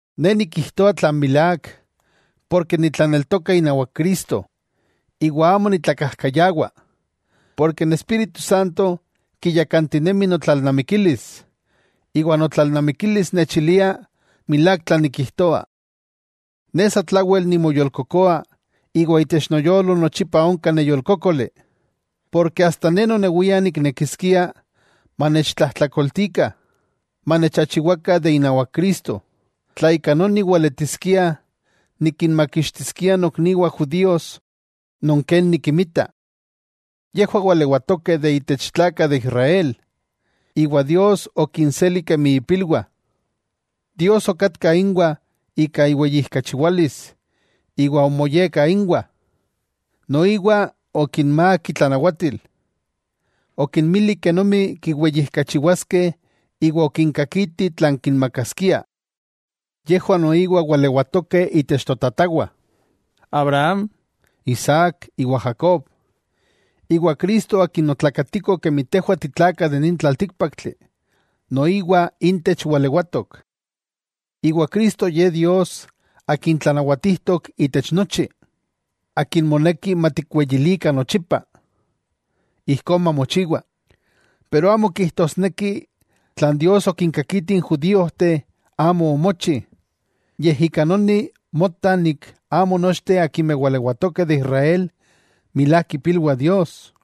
Ne nikijtoa tlan milák porke nitlaneltoka inawak Cristo, iwa amo nitlakajkayawa, porke n Espíritu Santo kiyakantinemi notlalnamikilis, iwa notlalnamikilis nechilia milák tlan nikijtoa. Ne sa tlawel nimoyolkokoa iwa itech noyolo nochipa onka neyolkókoli, porke asta ne nonewia niknekiskia manechtlajtlakoltikah, manechachiwakah de inawak Cristo, tla ika noni weletiskia nikinmakixtiskia nokniwah judíos non ken nikinmita. Yejwah walewatokeh de intech tlakah de Israel, iwa Dios okinseli kemi ipilwah. Dios okatka inwah ika iweyijkachiwalis iwa omoyekka inwah, noiwa okinmák itlanawatil, okinmili kenomi kiweyijkachiwaskeh iwa okinkakiti tlan kinmakaskia. Yejwah noiwa walewatokeh intech totatawah; Abraham, Isaac iwa Jacob, iwa Cristo Akin otlakatiko kemi tejwah titlakah de nin tlaltíkpaktli noiwa intech walewatok. Iwa Cristo Ye Dios Akin tlanawatijtok itech nochi, ¡Akin moneki matikweyilikah nochipa! Ijkó mamochiwa. Pero amo kijtosneki tlan Dios okinkakiti n judíojteh amo omochi; yej ika noni mota nik amo nochteh akimeh walewatokeh de Israel milák ipilwah Dios.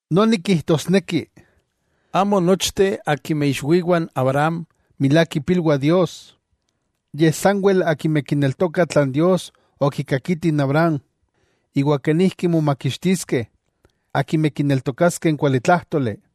Noni kijtosneki, amo nochteh akimeh ixwiwah Abraham milák ipilwah Dios, yej sanwel akimeh kineltokah tlan Dios okikakiti Abraham, iwa kenijki momakixtiskeh akimeh kineltokaskeh n kualitlájtoli.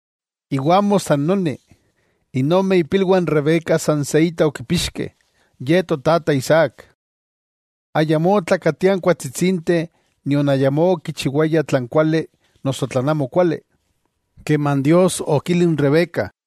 Iwa amo san noni. N ome ipilwah n Rebeca san se inta okipixkeh, ye totata Isaac. Ayamó otlakatiah n kuatsitsinteh nion ayamó okichiwayah tlan kuali noso tlan amokuali keman Dios okili n Rebeca: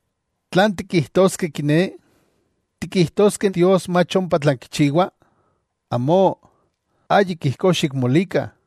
¿Tlan tikijtoskeh kiné? ¿Tikijtoskeh Dios mach ompa tlan kichiwa? ¡Amó, ayik ijkó xikmolikah!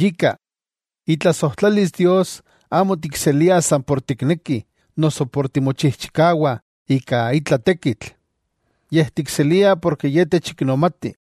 Yika, itlasojtlalis Dios amo tikseliah san por tiknekih noso por timochijchikawah ika itla tekitl, yej tikseliah porke Ye techiknomati.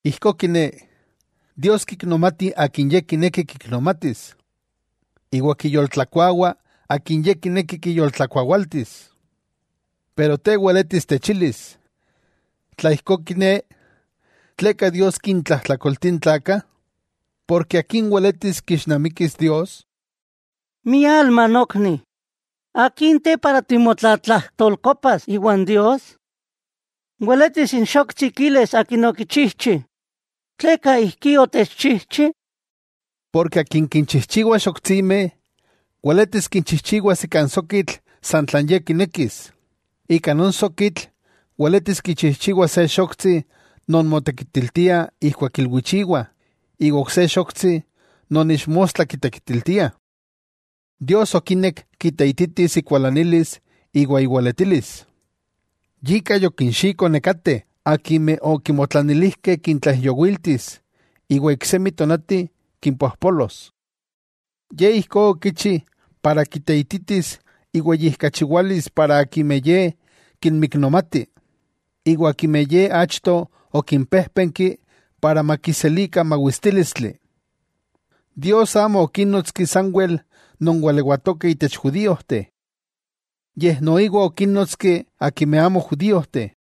Ijkó kiné, Dios kiknomati akin Ye kineki kiknomatis, iwa kiyoltlakuawa akin Ye kineki kiyoltlakuawaltis. Pero te weletis techilis: “Tla ijkó kiné, ¿tleka Dios kintlajtlakoltia n tlakah, porke akin weletis kixnamikis Dios?” ¡Mialma nokni! ¿Akin te para timotlatlajtolkopas iwan Dios? Weletis n xoktsi kilis akin okichijchi: “¿Tleka ijkí otechchijchi?” Porke akin kinchijchiwa xoktsimeh weletis kichijchiwas ika n sokitl san tlan ye kinekis; ika non sokitl weletis kichijchiwas se xoktsi non motekitiltia ijkuak ilwichiwah, iwa ok se xoktsi non ixmostla kitekitiltiah. Dios okinek kiteititis ikualanilis iwa iweletilis, yika yokinxiko nekateh akimeh okimotlanilijkeh kintlaijyowiltis iwa iksemi tonati kimpojpolos. Ye ijkó okichi para kiteititis iweyijkachiwalis para akimeh Ye kinmiknomati, iwa akimeh Ye achto okimpéjpenki para makiselikah mawistílistli. Dios amo okínnotski sanwel non walewatokeh itech judíojteh, yej noiwa okinnótski akimeh amo judíojteh.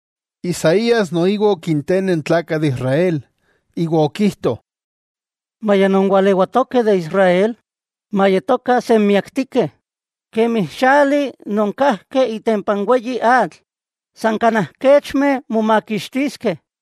Isaías noiwa okinteneh n tlakah de Israel iwa okijto: “Maya non walewatokeh de Israel mayetokah senmiaktikeh kemi xali non kajki itempa n weyi atl, san kanaj kechmeh momakixtiskeh,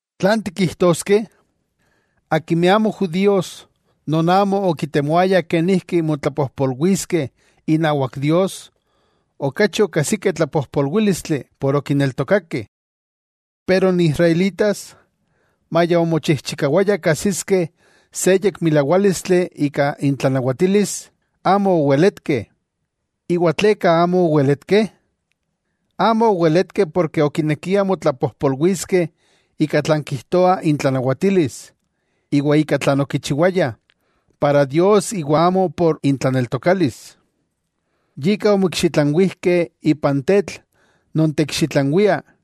¿Tlan tikijtoskeh? Akimeh amo judíos, non amo okitemoayah kenijki motlapojpolwiskeh inawak Dios okachi okajsikeh tlapojpolwílistli por okineltokakeh. Pero n Israelitas, maya omochijchikawayah kajsiskeh se yekmilawálistli ika intlanawatilis, amo oweletkeh. ¿Iwa tleka amo oweletkeh? Amo oweletkeh porke okinekiah motlapojpolwiskeh ika tlan kijtoa intlanawatilis, ika tlan okichiwayah para Dios iwa amo por intlaneltokalis. Yika omoikxitlanwijkeh ipan “tetl non teikxitlanwia”,